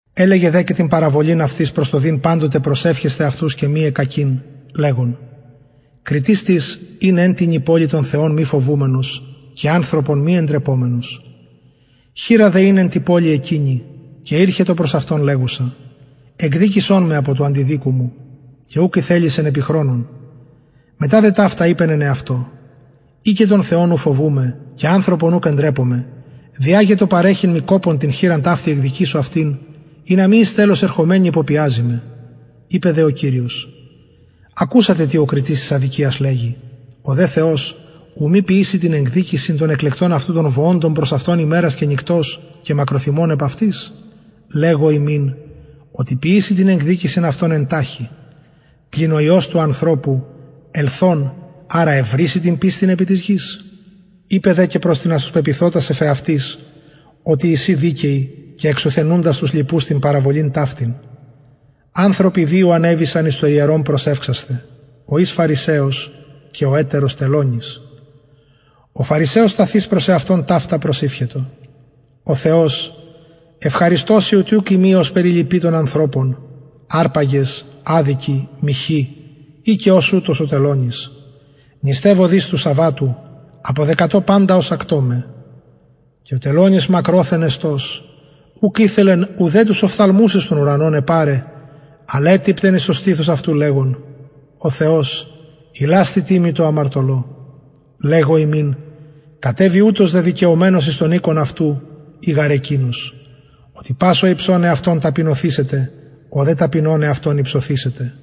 ελεγεν δε και παραβολην αυτοις προς το δειν παντοτε προσευχεσθαι και μη εκκακειν λεγων κριτης τις ην εν τινι πολει τον θεον μη φοβουμενος και ανθρωπον μη εντρεπομενος χηρα δε ην εν τη πολει εκεινη και ηρχετο προς αυτον λεγουσα εκδικησον με απο του αντιδικου μου και ουκ ηθελησεν επι χρονον μετα δε ταυτα ειπεν εν εαυτω ει και τον θεον ου φοβουμαι και ανθρωπον ουκ εντρεπομαι δια γε το παρεχειν μοι κοπον την χηραν ταυτην εκδικησω αυτην ινα μη εις τελος ερχομενη υποπιαζη με ειπεν δε ο κυριος ακουσατε τι ο κριτης της αδικιας λεγει ο δε θεος ου μη ποιηση την εκδικησιν των εκλεκτων αυτου των βοωντων προς αυτον ημερας και νυκτος και μακροθυμων επ αυτοις λεγω υμιν οτι ποιησει την εκδικησιν αυτων εν ταχει πλην ο υιος του ανθρωπου ελθων αρα ευρησει την πιστιν επι της γης ειπεν δε προς τινας τους πεποιθοτας εφ εαυτοις οτι εισιν δικαιοι και εξουθενουντας τους λοιπους την παραβολην ταυτην ανθρωποι δυο ανεβησαν εις το ιερον προσευξασθαι ο εις φαρισαιος και ο ετερος τελωνης ο φαρισαιος σταθεις προς εαυτον ταυτα προσηυχετο ο θεος ευχαριστω σοι οτι ουκ ειμι ωσπερ οι λοιποι των ανθρωπων αρπαγες αδικοι μοιχοι η και ως ουτος ο τελωνης νηστευω δις του σαββατου αποδεκατω παντα οσα κτωμαι και ο τελωνης μακροθεν εστως ουκ ηθελεν ουδε τους οφθαλμους εις τον ουρανον επαραι αλλ ετυπτεν εις το στηθος αυτου λεγων ο θεος ιλασθητι μοι τω αμαρτωλω λεγω υμιν κατεβη ουτος δεδικαιωμενος εις τον οικον αυτου η γαρ εκεινος οτι πας ο υψων εαυτον ταπεινωθησεται ο δε ταπεινων εαυτον υψωθησεται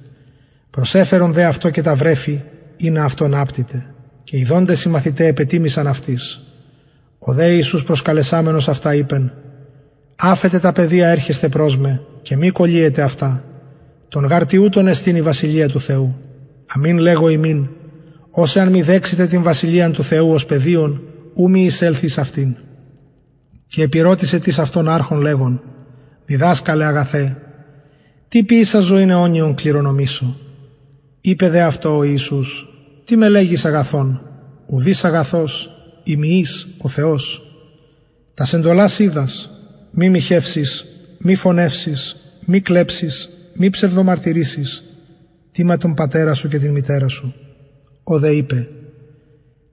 προσεφερον δε αυτω και τα βρεφη ινα αυτων απτηται ιδοντες δε οι μαθηται επετιμησαν αυτοις ο δε ιησους προσκαλεσαμενος αυτα ειπεν αφετε τα παιδια ερχεσθαι προς με και μη κωλυετε αυτα των γαρ τοιουτων εστιν η βασιλεια του θεου αμην λεγω υμιν ος εαν μη δεξηται την βασιλειαν του θεου ως παιδιον ου μη εισελθη εις αυτην και επηρωτησεν τις αυτον αρχων λεγων διδασκαλε αγαθε τι ποιησας ζωην αιωνιον κληρονομησω ειπεν δε αυτω ο ιησους τι με λεγεις αγαθον ουδεις αγαθος ει μη εις ο θεος τας εντολας οιδας μη μοιχευσης μη φονευσης μη κλεψης μη ψευδομαρτυρησης τιμα τον πατερα σου και την μητερα σου ο δε ειπεν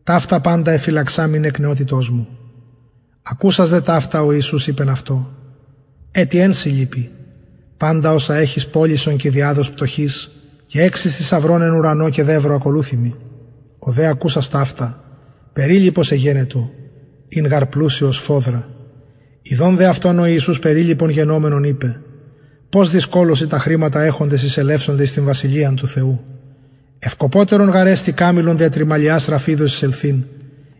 ταυτα παντα εφυλαξαμην εκ νεοτητος μου ακουσας δε ταυτα ο ιησους ειπεν αυτω ετι εν σοι λειπει παντα οσα εχεις πωλησον και διαδος πτωχοις και εξεις θησαυρον εν ουρανω και δευρο ακολουθει μοι ο δε ακουσας ταυτα περιλυπος εγενετο ην γαρ πλουσιος σφοδρα ιδων δε αυτον ο ιησους περιλυπον γενομενον ειπεν πως δυσκολως οι τα χρηματα εχοντες εισελευσονται εις την βασιλειαν του θεου ευκοπωτερον γαρ εστιν καμηλον δια τρυμαλιας ραφιδος εισελθειν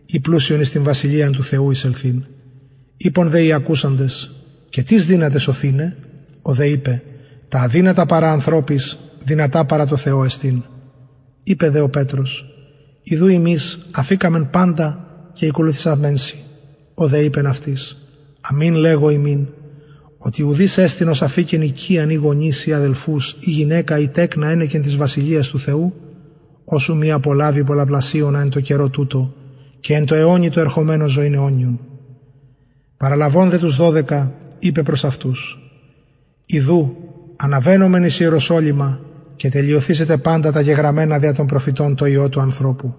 η πλουσιον εις την βασιλειαν του θεου εισελθειν ειπον δε οι ακουσαντες και τις δυναται σωθηναι ο δε ειπεν τα αδυνατα παρα ανθρωποις δυνατα εστιν παρα τω θεω ειπεν δε πετρος ιδου ημεις αφηκαμεν παντα και ηκολουθησαμεν σοι ο δε ειπεν αυτοις αμην λεγω υμιν οτι ουδεις εστιν ος αφηκεν οικιαν η γονεις η αδελφους η γυναικα η τεκνα ενεκεν της βασιλειας του θεου ος ου μη απολαβη πολλαπλασιονα εν τω καιρω τουτω και εν τω αιωνι τω ερχομενω ζωην αιωνιον παραλαβων δε τους δωδεκα ειπεν προς αυτους ιδου αναβαινομεν εις ιεροσολυμα και τελεσθησεται παντα τα γεγραμμενα δια των προφητων τω υιω του ανθρωπου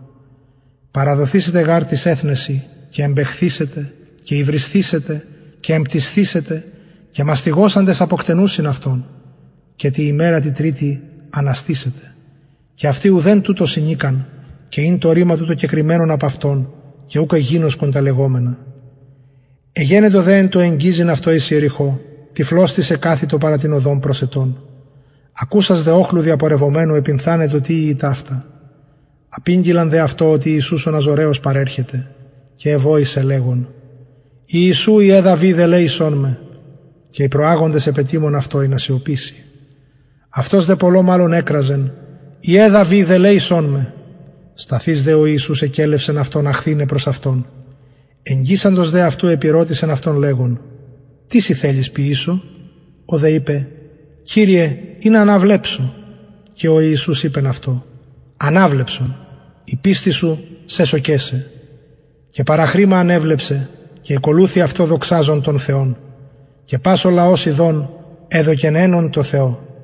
παραδοθησεται γαρ τοις εθνεσιν και εμπαιχθησεται και υβρισθησεται και εμπτυσθησεται και μαστιγωσαντες αποκτενουσιν αυτον και τη ημερα τη τριτη αναστησεται και αυτοι ουδεν τουτων συνηκαν και ην το ρημα τουτο κεκρυμμενον απ αυτων και ουκ εγινωσκον τα λεγομενα εγενετο δε εν τω εγγιζειν αυτον εις ιεριχω τυφλος τις εκαθητο παρα την οδον προσαιτων ακουσας δε οχλου διαπορευομενου επυνθανετο τι ειη τουτο απηγγειλαν δε αυτω οτι ιησους ο ναζωραιος παρερχεται και εβοησεν λεγων ιησου υιε δαυιδ ελεησον με και οι προαγοντες επετιμων αυτω ινα σιωπηση αυτος δε πολλω μαλλον εκραζεν υιε δαυιδ ελεησον με σταθεις δε ο ιησους εκελευσεν αυτον αχθηναι προς αυτον εγγισαντος δε αυτου επηρωτησεν αυτον λεγων τι σοι θελεις ποιησω ο δε ειπεν κυριε ινα αναβλεψω και ο ιησους ειπεν αυτω αναβλεψον η πιστις σου σεσωκεν σε και παραχρημα ανεβλεψεν και ηκολουθει αυτω δοξαζων τον θεον και πας ο λαος ιδων εδωκεν αινον τω θεω